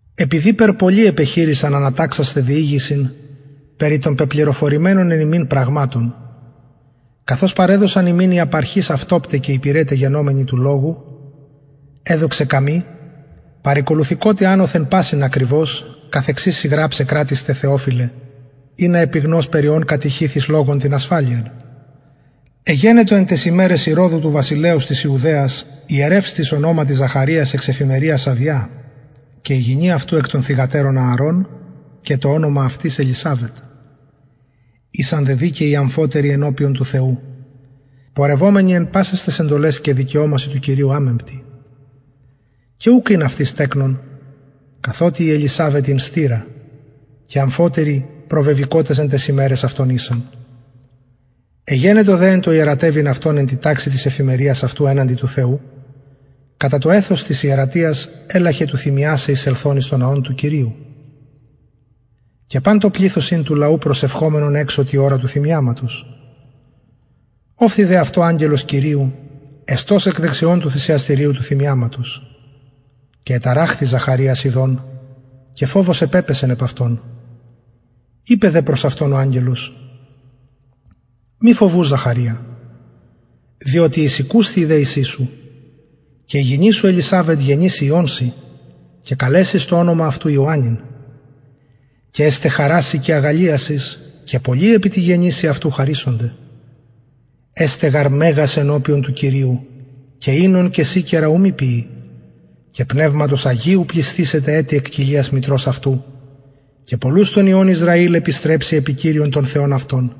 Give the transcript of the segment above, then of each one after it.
επειδηπερ πολλοι επεχειρησαν αναταξασθαι διηγησιν περι των πεπληροφορημενων εν ημιν πραγματων καθως παρεδοσαν ημιν οι απ αρχης αυτοπται και υπηρεται γενομενοι του λογου εδοξεν καμοι παρηκολουθηκοτι ανωθεν πασιν ακριβως καθεξης σοι γραψαι κρατιστε θεοφιλε ινα επιγνως περι ων κατηχηθης λογων την ασφαλειαν εγενετο εν ταις ημεραις ηρωδου του βασιλεως της ιουδαιας ιερευς τις ονοματι ζαχαριας εξ εφημεριας αβια και η γυνη αυτου εκ των θυγατερων ααρων και το ονομα αυτης ελισαβετ ησαν δε δικαιοι αμφοτεροι ενωπιον του θεου πορευομενοι εν πασαις ταις εντολαις και δικαιωμασιν του κυριου αμεμπτοι και ουκ ην αυτοις τεκνον καθοτι η ελισαβετ ην στειρα και αμφοτεροι προβεβηκοτες εν ταις ημεραις αυτων ησαν εγενετο δε εν τω ιερατευειν αυτον εν τη ταξει της εφημεριας αυτου εναντι του θεου κατα το εθος της ιερατειας ελαχεν του θυμιασαι εισελθων εις τον ναον του κυριου και παν το πληθος ην του λαου προσευχομενον εξω τη ωρα του θυμιαματος ωφθη δε αυτω αγγελος κυριου εστως εκ δεξιων του θυσιαστηριου του θυμιαματος και εταραχθη ζαχαριας ιδων και φοβος επεπεσεν επ αυτον ειπεν δε προς αυτον ο αγγελος μη φοβου ζαχαρια διοτι εισηκουσθη η δεησις σου και η γυνη σου ελισαβετ γεννησει υιον σοι και καλεσεις το ονομα αυτου ιωαννην και εσται χαρα σοι και αγαλλιασις και πολλοι επι τη γεννησει αυτου χαρησονται εσται γαρ μεγας ενωπιον του κυριου και οινον και σικερα ου μη πιη και πνευματος αγιου πλησθησεται ετι εκ κοιλιας μητρος αυτου και πολλους των υιων ισραηλ επιστρεψει επι κυριον τον θεον αυτων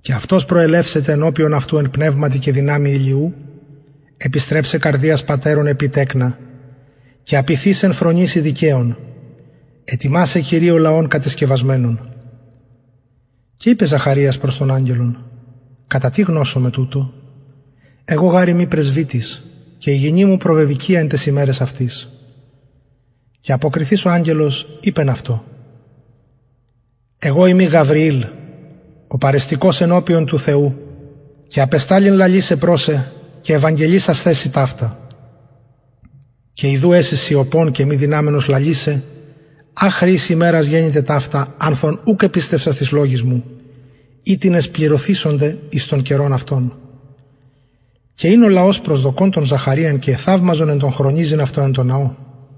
και αυτος προελευσεται ενωπιον αυτου εν πνευματι και δυναμει ηλιου επιστρεψαι καρδιας πατερων επι τεκνα και απειθεις εν φρονησει δικαιων ετοιμασαι κυριω λαον κατεσκευασμενον και ειπεν ζαχαριας προς τον αγγελον κατα τι γνωσομαι τουτο εγω γαρ ειμι πρεσβυτης και η γυνη μου προβεβηκυια εν ταις ημεραις αυτης και αποκριθεις ο αγγελος ειπεν αυτω εγω ειμι γαβριηλ ο παρεστηκως ενωπιον του θεου και απεσταλην λαλησαι προς σε και ευαγγελισασθαι σοι ταυτα και ιδου εση σιωπων και μη δυναμενος λαλησαι αχρι ης ημερας γενηται ταυτα ανθ ων ουκ επιστευσας τοις λογοις μου οιτινες πληρωθησονται εις τον καιρον αυτων και ην ο λαος προσδοκων τον ζαχαριαν και εθαυμαζον εν τω χρονιζειν αυτον εν τω ναω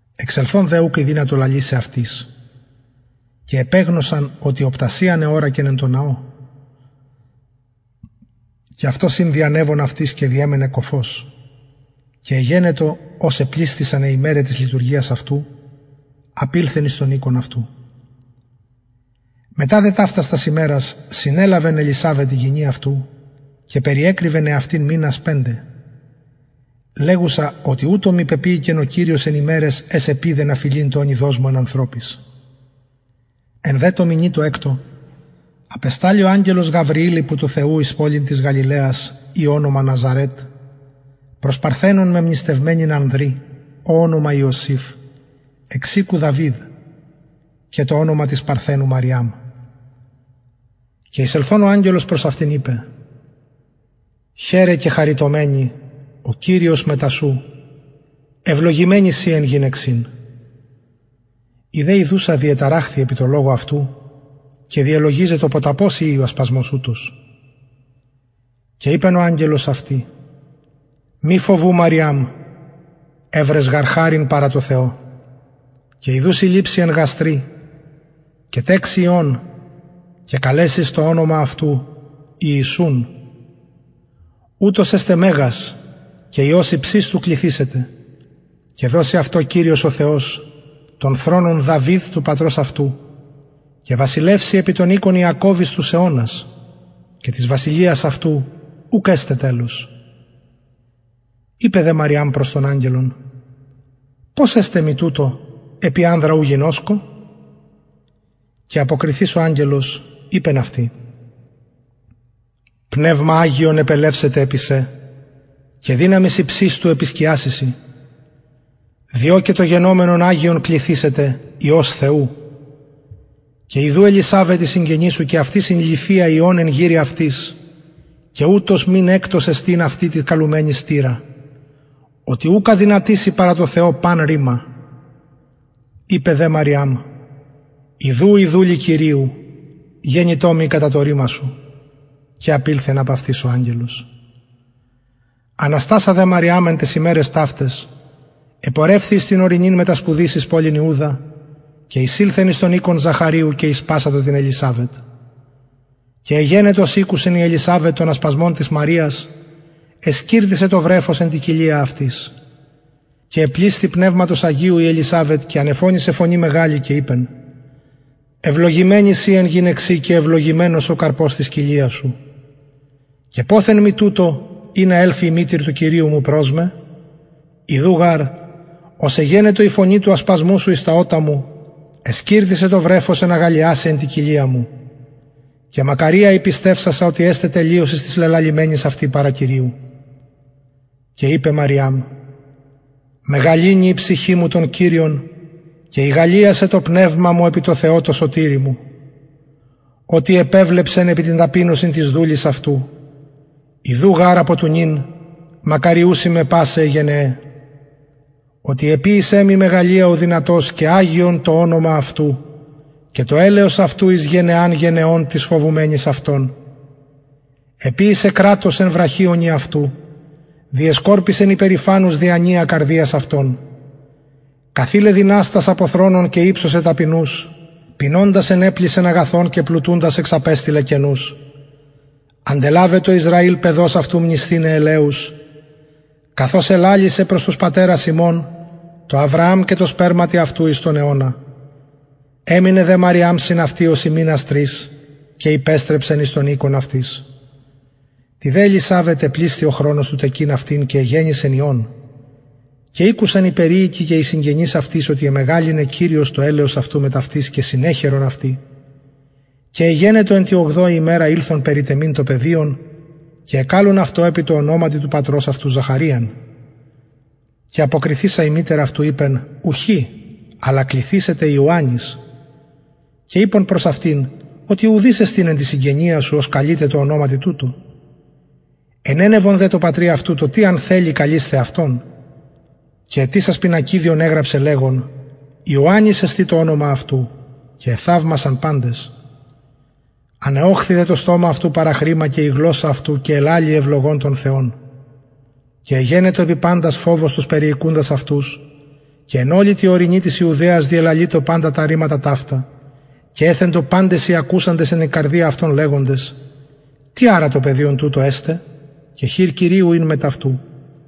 εξελθων δε ουκ ηδυνατο λαλησαι αυτοις και επεγνωσαν οτι οπτασιαν εωρακεν εν τω ναω και αυτος ην διανευων αυτοις και διεμενεν κωφος και εγενετο ως επλησθησαν αι ημεραι της λειτουργιας αυτου απηλθεν εις τον οικον αυτου μετα δε ταυτας τας ημερας συνελαβεν ελισαβετ η γυνη αυτου και περιεκρυβεν εαυτην μηνας πεντε λεγουσα οτι ουτως μοι πεποιηκεν ο κυριος εν ημεραις αις επειδεν αφελειν το ονειδος μου εν ανθρωποις εν δε τω μηνι τω εκτω απεσταλη ο αγγελος γαβριηλ υπο του θεου εις πολιν της γαλιλαιας η ονομα ναζαρετ προς παρθενον μεμνηστευμενην ανδρι ω ονομα ιωσηφ εξ οικου δαυιδ και το ονομα της παρθενου μαριαμ και εισελθων ο αγγελος προς αυτην ειπεν χαιρε κεχαριτωμενη ο κυριος μετα σου ευλογημενη συ εν γυναιξιν η δε ιδουσα διεταραχθη επι τω λογω αυτου και διελογιζετο ποταπος ειη ο ασπασμος ουτος και ειπεν ο αγγελος αυτη μη φοβου μαριαμ ευρες γαρ χαριν παρα τω θεω και ιδου συλληψη εν γαστρι και τεξη υιον και καλεσεις το ονομα αυτου ιησουν ουτος εσται μεγας και υιος υψιστου κληθησεται και δωσει αυτω κυριος ο θεος τον θρονον δαυιδ του πατρος αυτου και βασιλευσει επι τον οικον ιακωβ εις τους αιωνας και της βασιλειας αυτου ουκ εσται τελος ειπεν δε μαριαμ προς τον αγγελον πως εσται τουτο επει ανδρα ου γινωσκω και αποκριθεις ο αγγελος ειπεν αυτη πνευμα αγιον επελευσεται επι σε και δυναμις υψιστου επισκιασει σοι διο και το γεννωμενον αγιον κληθησεται υιος θεου και ιδου ελισαβετ η συγγενης σου και αυτη συνειληφυια υιον εν γηρει αυτης και ουτος μην εκτος εστιν αυτη τη καλουμενη στειρα οτι ουκ αδυνατησει παρα τω θεω παν ρημα ειπεν δε μαριαμ ιδου η δουλη κυριου γενοιτο μοι κατα το ρημα σου και απηλθεν απ αυτης ο αγγελος αναστασα δε μαριαμ εν ταις ημεραις ταυταις επορευθη εις την ορεινην μετα σπουδης εις πολιν ιουδα και εισηλθεν εις τον οικον ζαχαριου και ησπασατο την ελισαβετ και εγενετο ως ηκουσεν η ελισαβετ τον ασπασμον της μαριας εσκιρτησεν το βρεφος εν τη κοιλια αυτης και επλησθη πνευματος αγιου η ελισαβετ και ανεφωνησεν φωνη μεγαλη και ειπεν ευλογημενη συ εν γυναιξιν και ευλογημενος ο καρπος της κοιλιας σου και ποθεν μοι τουτο ινα ελθη η μητηρ του κυριου μου προς με ιδου γαρ ως εγενετο η φωνη του ασπασμου σου εις τα ωτα μου εσκιρτησεν το βρεφος εν αγαλλιασει εν τη κοιλια μου και μακαρια η πιστευσασα οτι εσται τελειωσις τοις λελαλημενοις αυτη παρα κυριου και ειπεν μαριαμ μεγαλυνει η ψυχη μου τον κυριον και ηγαλλιασεν το πνευμα μου επι τω θεω τω σωτηρι μου οτι επεβλεψεν επι την ταπεινωσιν της δουλης αυτου ιδου γαρ απο του νυν μακαριουσιν με πασαι αι γενεαι οτι εποιησεν μοι μεγαλεια ο δυνατος και αγιον το ονομα αυτου και το ελεος αυτου εις γενεας γενεων τοις φοβουμενοις αυτον εποιησεν κρατος εν βραχιονι αυτου διεσκορπισεν υπερηφανους διανοια καρδιας αυτων καθειλεν δυναστας απο θρονων και υψωσεν ταπεινους πεινωντας ενεπλησεν αγαθων και πλουτουντας εξαπεστειλεν κενους αντελαβετο ισραηλ παιδος αυτου μνησθηναι ελεους καθως ελαλησεν προς τους πατερας ημων τω αβρααμ και τω σπερματι αυτου εις τον αιωνα εμεινεν δε μαριαμ συν αυτη ωσει μηνας τρεις και υπεστρεψεν εις τον οικον αυτης τη δε ελισαβετ επλησθη ο χρονος του τεκειν αυτην και εγεννησεν υιον και ηκουσαν οι περιοικοι και οι συγγενεις αυτης οτι εμεγαλυνεν κυριος το ελεος αυτου μετ αυτης και συνεχαιρον αυτη και εγενετο εν τη ογδοη ημερα ηλθον περιτεμειν το παιδιον και εκαλουν αυτο επι τω ονοματι του πατρος αυτου ζαχαριαν και αποκριθεισα η μητηρ αυτου ειπεν ουχι αλλα κληθησεται ιωαννης και ειπον προς αυτην οτι ουδεις εστιν εν τη συγγενεια σου ος καλειται τω ονοματι τουτω ενενευον δε τω πατρι αυτου το τι αν θελοι καλεισθαι αυτον και αιτησας πινακιδιον εγραψεν λεγων ιωαννης εστιν το ονομα αυτου και εθαυμασαν παντες ανεωχθη δε το στομα αυτου παραχρημα και η γλωσσα αυτου και ελαλει ευλογων τον θεον και εγενετο επι παντας φοβος τους περιοικουντας αυτους και εν ολη τη ορεινη της ιουδαιας διελαλειτο παντα τα ρηματα ταυτα και εθεντο παντες οι ακουσαντες εν τη καρδια αυτων λεγοντες τι αρα το παιδιον τουτο εσται και χειρ κυριου ην μετ αυτου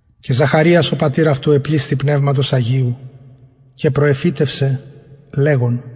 και ζαχαριας ο πατηρ αυτου επλησθη πνευματος αγιου και προεφητευσεν λεγων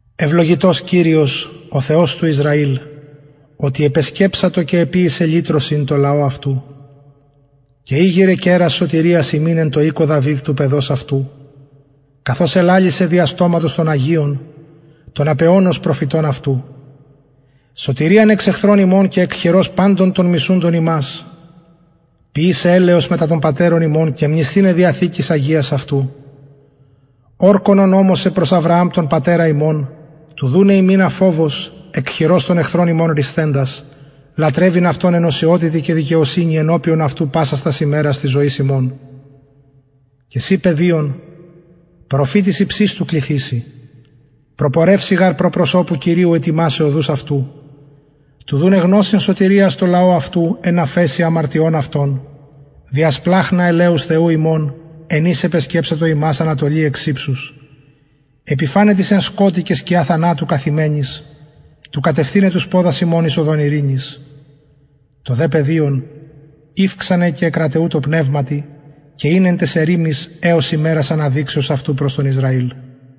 ευλογητος κυριος ο θεος του ισραηλ οτι επεσκεψατο και εποιησεν λυτρωσιν τω λαω αυτου και ηγειρεν κερας σωτηριας ημιν εν τω οικω δαυιδ του παιδος αυτου καθως ελαλησεν δια στοματος των αγιων των απ αιωνος προφητων αυτου σωτηριαν εξ εχθρων ημων και εκ χειρος παντων των μισουντων ημας ποιησαι ελεος μετα των πατερων ημων και μνησθηναι διαθηκης αγιας αυτου ορκον ον ωμοσεν προς αβρααμ τον πατερα ημων του δουναι ημιν αφοβως εκ χειρος των εχθρων ημων ρυσθεντας λατρευειν αυτω εν οσιοτητι και δικαιοσυνη ενωπιον αυτου πασας τας ημερας της ζωης ημων και συ παιδιον προφητης υψιστου κληθηση προπορευση γαρ προ προσωπου κυριου ετοιμασαι οδους αυτου του δουναι γνωσιν σωτηριας τω λαω αυτου εν αφεσει αμαρτιων αυτων δια σπλαγχνα ελεους θεου ημων εν οις επεσκεψατο ημας ανατολη εξ υψους επιφαναι τοις εν σκοτει και σκια θανατου καθημενοις του κατευθυναι τους ποδας ημων εις οδον ειρηνης το δε παιδιον ηυξανεν και εκραταιουτο πνευματι και ην εν ταις ερημοις εως ημερας αναδειξεως αυτου προς τον ισραηλ